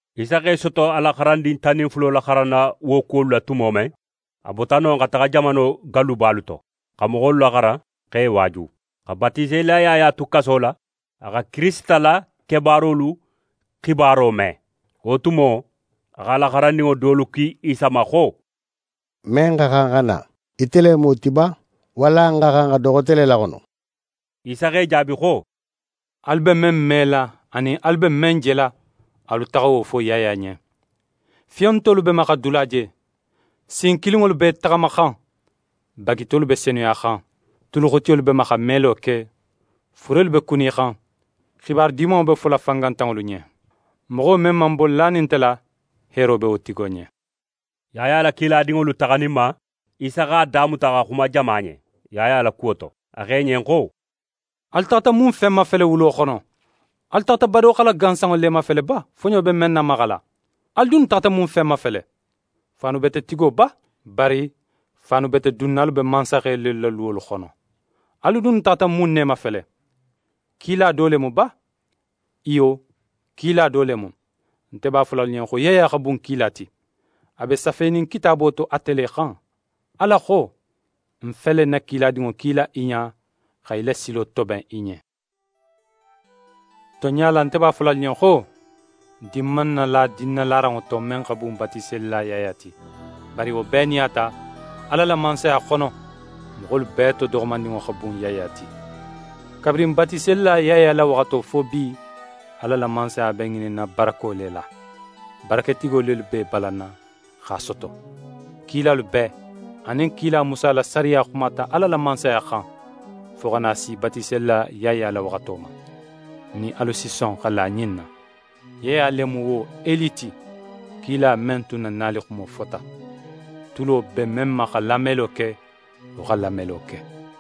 Isa x'é soto a la xarandin tan nin fulo laxaranna wo kuwolu la tumo men, a bota non xa taxa jamano gallubalu to, xa moxolu laxaran, x'e waaju. Xa Batiselila Yaya tu kaso la, a xa Kirisita la kebaarolu xibaro me. Wo tumo, a x'a la xarandinŋo dolu ki Isa ma xo: «Men xa xan xa na, ite le mu wo ti ba, walla n xa xan xa do xote le laxono?» Isa x'e jaabi xo: «Alu be men mela anin alu be men jela, alu taxa wo fo Yaya ɲen: “Fiyontolu be ma xa dula je, sin kilinŋolu b'e taxamaxan, bagitolu be senuyaxan, tuluxutiyolu be ma xa melo ke, furelu be kunixan, xibaru Dimanŋo be fola fangantanŋolu ɲen.” Moxo men man bo lanin nte la, heero be wo tigo ɲen.» Yaya la kiladinŋolu taxaninma, Isa x'a damuta xa xuma jama ɲen Yaya la kuwo to. A xo i ɲen xo: «Alu taxata mun fen mafele wulo xono? Alu taxata badoxala gansanŋo le mafele ba, foɲo be men namaxala? Alu dunnu taxata mun fen mafele? Faanubetetigo ba? Bari faanubetedunnalu be mansaxe lelu la luwolu xono. Alu dunnu taxata mun ne mafele? Kila do le mu ba? Iyo, kila do le mu. Nte b'a fola alu ɲen xo Yaya xa bun kila ti. A be safenin Kitaabo to ate le xan: “Ala xo: Ń fele ń na kiladinŋo kila í ɲa, xa í la silo toben í ɲen.” Tonɲa la, nte b'a fola alu ɲen xo: Din man nala dinnalaranŋo to, men xa bun Batiselila Yaya ti. Bari, wo bee nin a ta, Ala la Mansaya xono, moxolu bee to doxomandinŋo xa bun Yaya ti. Kabirin Batiselila Yaya la waxato fo bi, Ala la Mansaya be ŋininna barako le la, baraketigo lelu b'e balanna x'a soto. Kilalu bee anin kila Musa la sariya xumata Ala la Mansaya xan, fo xa na si Batiselila Yaya la waxato ma. Nin alu si son xa la ɲin na: Yaya le mu wo Eli ti, kila men tun na nalixumo fota. Tulo be men ma xa lamelo ke, wo xa lamelo ke!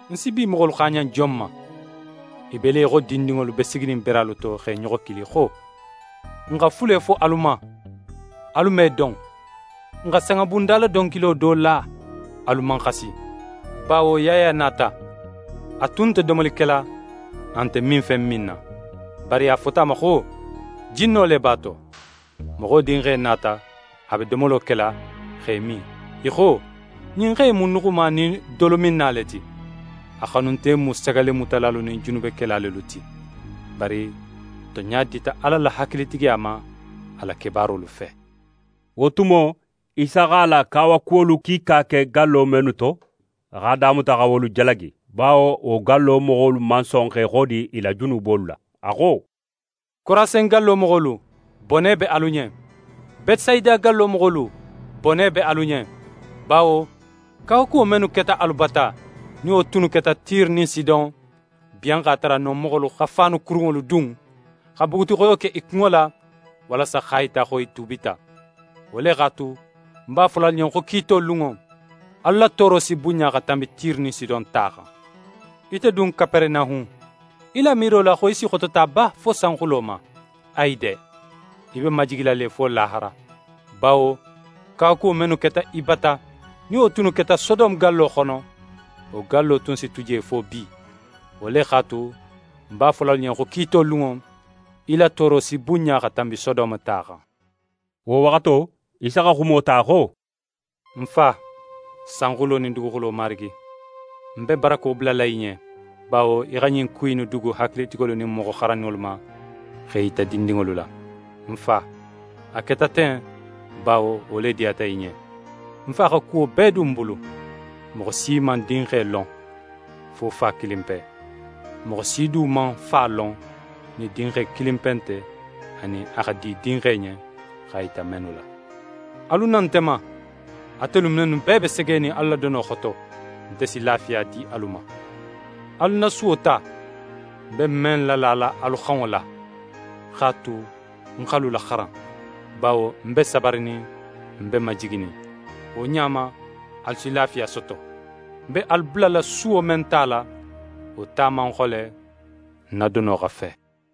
«Ń si bi moxolu xaaɲan jon ma? I be le í xo dindinŋolu be siginin beralu to x'e ɲoxo kili xo: “N xa fule fo alu ma, alu man i don. N xa sanŋabundala donkilo do la, alu man xasi.” Bawo Yaya nata, a tun nte domoli kela, a nte minfen minna. Bari a fota a ma xo ma xo: “Jinno le b'a to”. Moxo Dinxe nata, a be domolo kela, x'é min, i xo: “Ɲin xe in mu nuxuma nin dolominna le ti. A xanunte mu sagallemutalalu nin junubekela lelu ti.” Bari tonɲa dita Ala la hakilitigiya ma a la kebaarolu fe.» Wo tumo, Isa x'a la kawakuwolu kiika ke gallo mennu to, a x'a damuta xa wolu jalagi; bawo wo gallo moxolu man son x'e xodi i la junubolu la. A xo: «Korasin gallo moxolu, bone be alu ɲen! Betesayida gallo moxolu, bone be alu ɲen! Bawo kawakuwo mennu keta alu bata, nin wo tunnu keta Tire nin Sidon, biyan x'a tara non moxolu xa faanu kurunŋolu dun, xa bugutixoyo ke i kunŋo la, walasa x'a yita xo i tuubita. Wo le x'a tu, ń b'a fola alu ɲen xo kiito lunŋo, alu la tooro si bunɲa xa tanbi Tire nin Sidon ta xan. Ite dun Kaperenahun, í la miiro la xo í si xotota ba fo sanxulo ma? Ayi de! Í be majigila le fo lahara. Bawo kawakuwo mennu keta í bata, nin wo tunnu keta Sodome gallo xono, wo gallo tun si tu je fo bi. Wo le x'a tu, ń b'a fola alu ɲen xo kiito lunŋo, í la tooro si bunɲa xa tanbi Sodome ta xan.» Wo waxato, Isa xa xumo ta xo: «Ń Fa, sanxulo nin duguxulo Marigi, ń be barako bulala í ɲen; bawo í xa ɲin ku innu dugu hakilitigolu nin moxo xaranninŋolu ma, x'e yita dindinŋolu la. Ń Fa, a keta ten; bawo wo le diyata í ɲen. «Ń Fa xa kuwo bee dun ń bulu. Moxo si man Dinxe lon, fo Fa kilinpe. Moxo si du man Fa lon nin Dinxe kilinpe nte, anin a xa di Dinxe ɲen x'a yita mennu la. «Alu na nte ma, atelu mennu bee be segenin alu la dono xoto, nte si lafiya di alu ma. Alu ń na suwo ta, ń be men lala alu xanŋo la, x'a tu ń x'alu laxaran; bawo ń be sabarinin, ń be majiginin. Wo ɲa ma, alu si lafiya soto. Ń be alu bulala suwo men tala, wo ta man xole; ń na dono xa fe.»